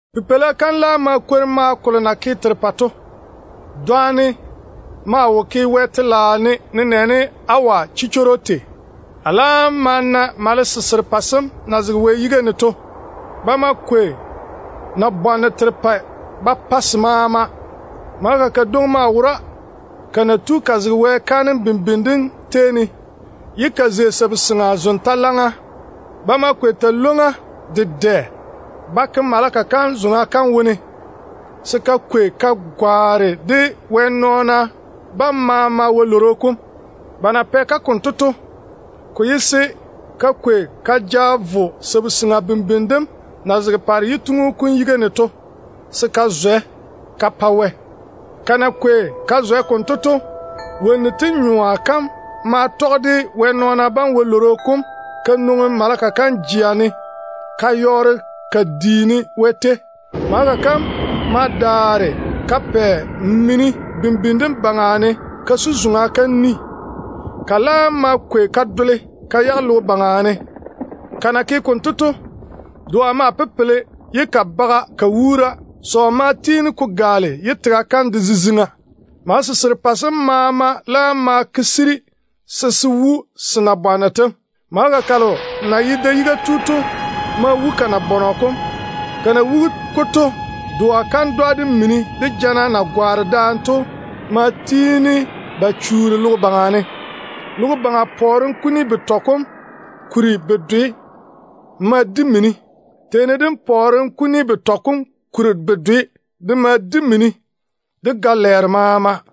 Pipeila kam laam ma kore maao kolo na ke terepɛ to. Dɔnne maa wo ke Wɛ telaao ne nenɛɛne awa chichworo tei. A laam ma na malese serepɛ sem na zega Wɛ yiga ne to. Ba ma kwei nabwanno terepɛ ba pa se maama. Maleka kadwoŋi ma ba ka zege Wɛ kaanem bimbini dem tei ne, ye ka zei sabu-seŋa min-chala zoŋa. Ba ma kwei talwoŋ-ywoŋa dedɛ ba ke maleka kam zoŋa kam ne, se ka kwei ka woli de Wɛ nɔɔna bam maama wɛ-lworo kom. Ba na pɛ-ka konto to, ko ye se ka kwei ka ja vo sabu-seŋa bimbini dem na zege paare yituŋu kom yiga ne to, se ka zwɛ ka pa Wɛ. Ka na kwei ka zwɛ konto to, wonnu tem nyoa kam maa tɔge de Wɛ nɔɔna bam wɛ-lworo kom ka nwoŋi maleka kam jea ne ka yɔɔre ka diini Wɛ tei. Maleka kam ma daare ka pɛ min-chala bimbini dem baŋa ne ka su zoŋa kam ni. Ka laam ma kwei mini dem ka dole ka yage logo baŋa ne. Ka na ke konto to, doa ma pepele ye ka baga ka wuura. Sɔɔ ma tiini ko gaale ye tega kam de ziziŋa. Malese serepɛ sem maama laam ma ti se yiga se se wu se nabwanno tem. Maleka kalo na ye da-yiga tu to ma wu ka nabɔnɔ kom. Ka na wugi-ko to, doa kandwa, de mini, de jana na gwaane daane to ma chuuri logo baŋa ne. Logo baŋa pɔɔrem kuni betɔ wone kuri bedwe ma di mini. Teeni dem pɔɔrem kuni betɔ wone kuri bedwe de ma di mini, de ga-lɛɛro maama.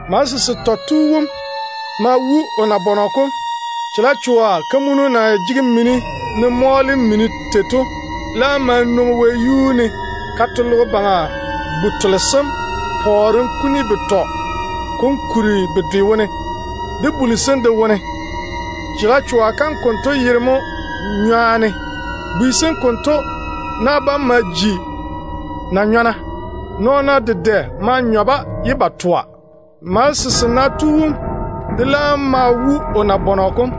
Malese setɔ tu wom ma wu o nabɔnɔ kom. Chalecho-kamunu na jege mini ne mɔɔle mini tei to laam ma nwoŋi wɛyuu ne ka to logo baŋa bu-tole sem pɔɔrem kuni betɔ kom kuri bedwe wone, de buli sem de wone. Chalechoa kam konto yere mo ‘Nywaane’. Bwi sem konto na bam ma ji na-chɛɛra. Nɔɔna dedɛ maa nyɔ-ba ye ba toa. Malese sena tu wom de laam ma wu o nabɔnɔ kom.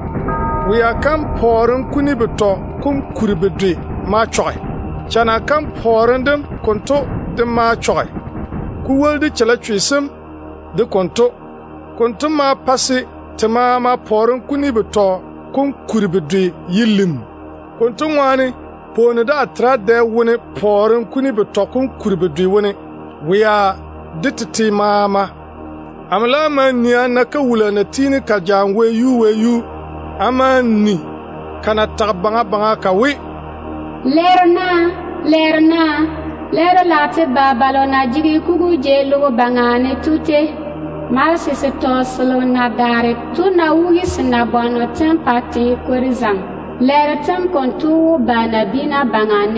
Wea kam pɔɔrem kuni betɔ wone kuri bedwe ma chɔge. Chana kam pɔɔrem dem konto de ma chɔge, ko woli de chalechwe sem de konto. Konto ma pa se te maama pɔɔrem kuni betɔ wone kuri bedwe ye lim. Konto ŋwaane, pwooni daa tera dɛ wone pɔɔrem kuni betɔ kom kuri bedwe wone, wea de tete maama. Amo laam ma nii a na kawula na tiini ka jaane wɛyuu wɛyuu. A ma ni ka na tage baŋa baŋa ka we, “Lɛɛro naa! Lɛɛro naa! Lɛɛro lage te yi balo na zoore logo baŋa ne to. Malese setɔ selo na daare to ná wugi se nabwanno tem pa te kwori zaŋe, lɛɛro tem konto wó ba nabiina baŋa.”